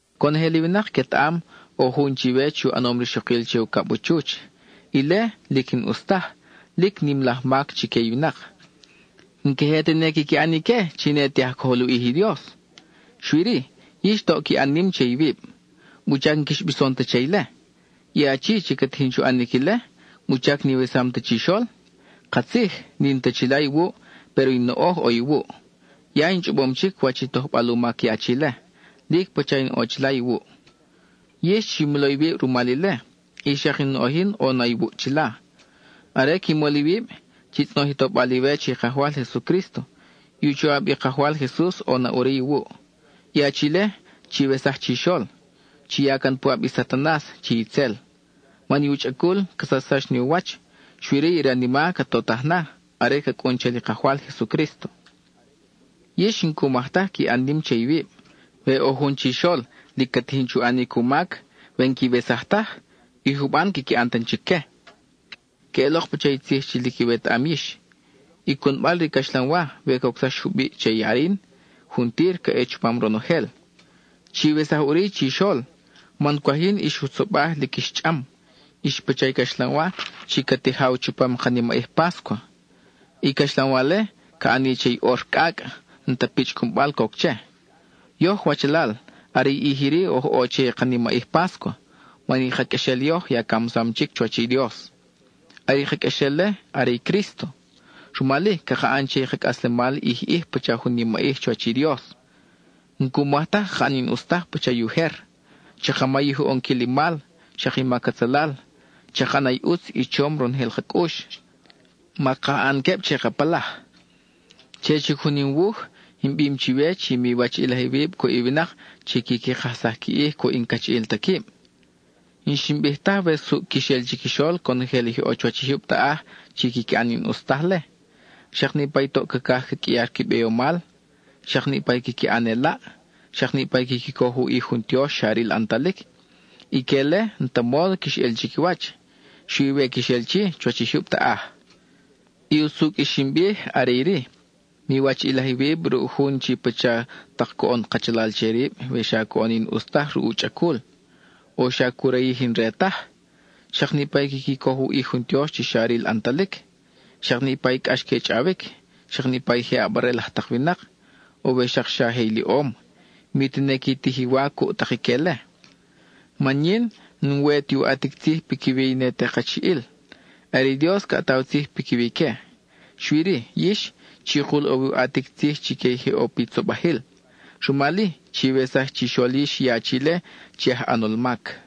Conojel i winak quetaʼam, ʼo jun chiwe chi u ʼanom rixokil che ucab u chuch. Ile, lic n-ʼus taj, lic nim laj mac chique i winak; n-queje tene quiqui ʼan ique chi ne te aj cojol u ʼij i Dios. Xui-ri ¡yix toʼ qui ʼan nim che iwib! ¿Wuchac n-quix bison ta che ile? I achi chi ca tijin chu ʼanic ile, ¿wuchac n-iwesam ta chixol? Katzij, n-in ta chila iwuʼ, péro in noʼoj ʼo iwuʼ. Ya in chʼobom chic wach i tojbal u mac i achi-le, lic pacha in ʼo chila iwuʼ. Yix chi molo iwib rumal ile; y xak in noʼoj yin ʼo na iwuʼ chila. Are qui mol iwib, chi tzʼonoj i tobal iwe che i Kajwal Jesucrísto; i u choʼab i Kajwal Jesus ʼo na ʼuri iwuʼ. I achi-le, chiwesaj chixol; chi ya can puʼab i Satanas (chi itzel), man i u chʼacul ca sachsax ni u wach, xui-ri i ranima ca totaj na, are ca cʼun chal i Kajwal Jesucrísto. Yix, n-cu maj taj qui ʼan nim che iwib. We ʼo jun chixol lic ca tijin chu ʼanic u mac, we n-quiwesaj taj, i juban quiqui ʼan tan chic que. Queʼelok pacha i tzij chi lic iwetaʼam yix: “I cunbal re i caxlanwa, we cocsax jubiʼ che i arin, juntir ca ʼe chupam ronojel.” Chiwesaj chixol, man cwaj yin ix jutzobaj lic ix chʼam. Ix pacha i caxlanwa chi ca tijaw chupam ka nimaʼij páscua; i caxlanwa-le, ca ʼani che i ʼor cʼacʼ, n-ta pichʼ cunbal coc che. Yoj wachalal, are i ʼij iri oj ʼo che i ka nimaʼij páscua, man i ka qʼuexel yoj ya camsam chic chuwach i Dios. Are i ka qʼuexel-le, are i Crísto. Rumal-i, caka ʼan che i ka cʼaslemal ʼij ʼij pacha jun nimaʼij chuwach i Dios; n-cu maj taj caka ʼan i n-ʼus taj pacha i ujer. Chaka mayij u ʼonquil i mal, xak i mac atzalal. Chaka ʼana i ʼutz i chom ronojel ka cʼux; maka ʼan queb che ka palaj. Che chic jun in wuj, in bim chiwe chi miwachiʼilaj iwib cuʼ winak chi quiqui kajsaj qui ʼij cuʼ i n-cachiʼil ta quib. N-xin bij taj we suʼ quix ʼel chiquixol conojel i je ʼo chuwach i jyub taʼaj chi quiqui ʼan i n-ʼus tajle, xak niʼpa i toʼ cacaj ca qʼuiar qui beyomal, xak niʼpa i quiqui ʼan elaʼ, xak niʼpa i quiqui coj u ʼij jun tiox xa ril ʼantalic. Ique-le, n-ta módo quix ʼel chiquiwach, xui we quix ʼel chi, chuwach i jyub taʼaj. I usucʼ i xin bij are iri: miwachiʼilaj iwib ruʼ jun chi pacha tak coʼon kachalal che rib we xa coʼon i n-ʼus taj ruʼ u chʼacul, o xa cu rayij i n-re taj, xak niʼpa i quiqui coj u ʼij jun tiox xa ril ʼantalic, xak niʼpa i cʼax que chʼawic; xak niʼpa je ʼabarel laj tak winak, o we xak xa je iliʼom; mi tene qui tij i wa cuʼ tak ique-le. Man yin, n-we tu ʼatic tzij piquiwi i ne te kachiʼil; are i Dios ca ʼataw tzij piquiwi ique. Xui-ri yix, chikul ʼo wi u ʼatic tzij chique i je ʼo pi tzobajil, Rumal-i, chiwesaj chixol yix i achi-le chi aj ʼanol mac.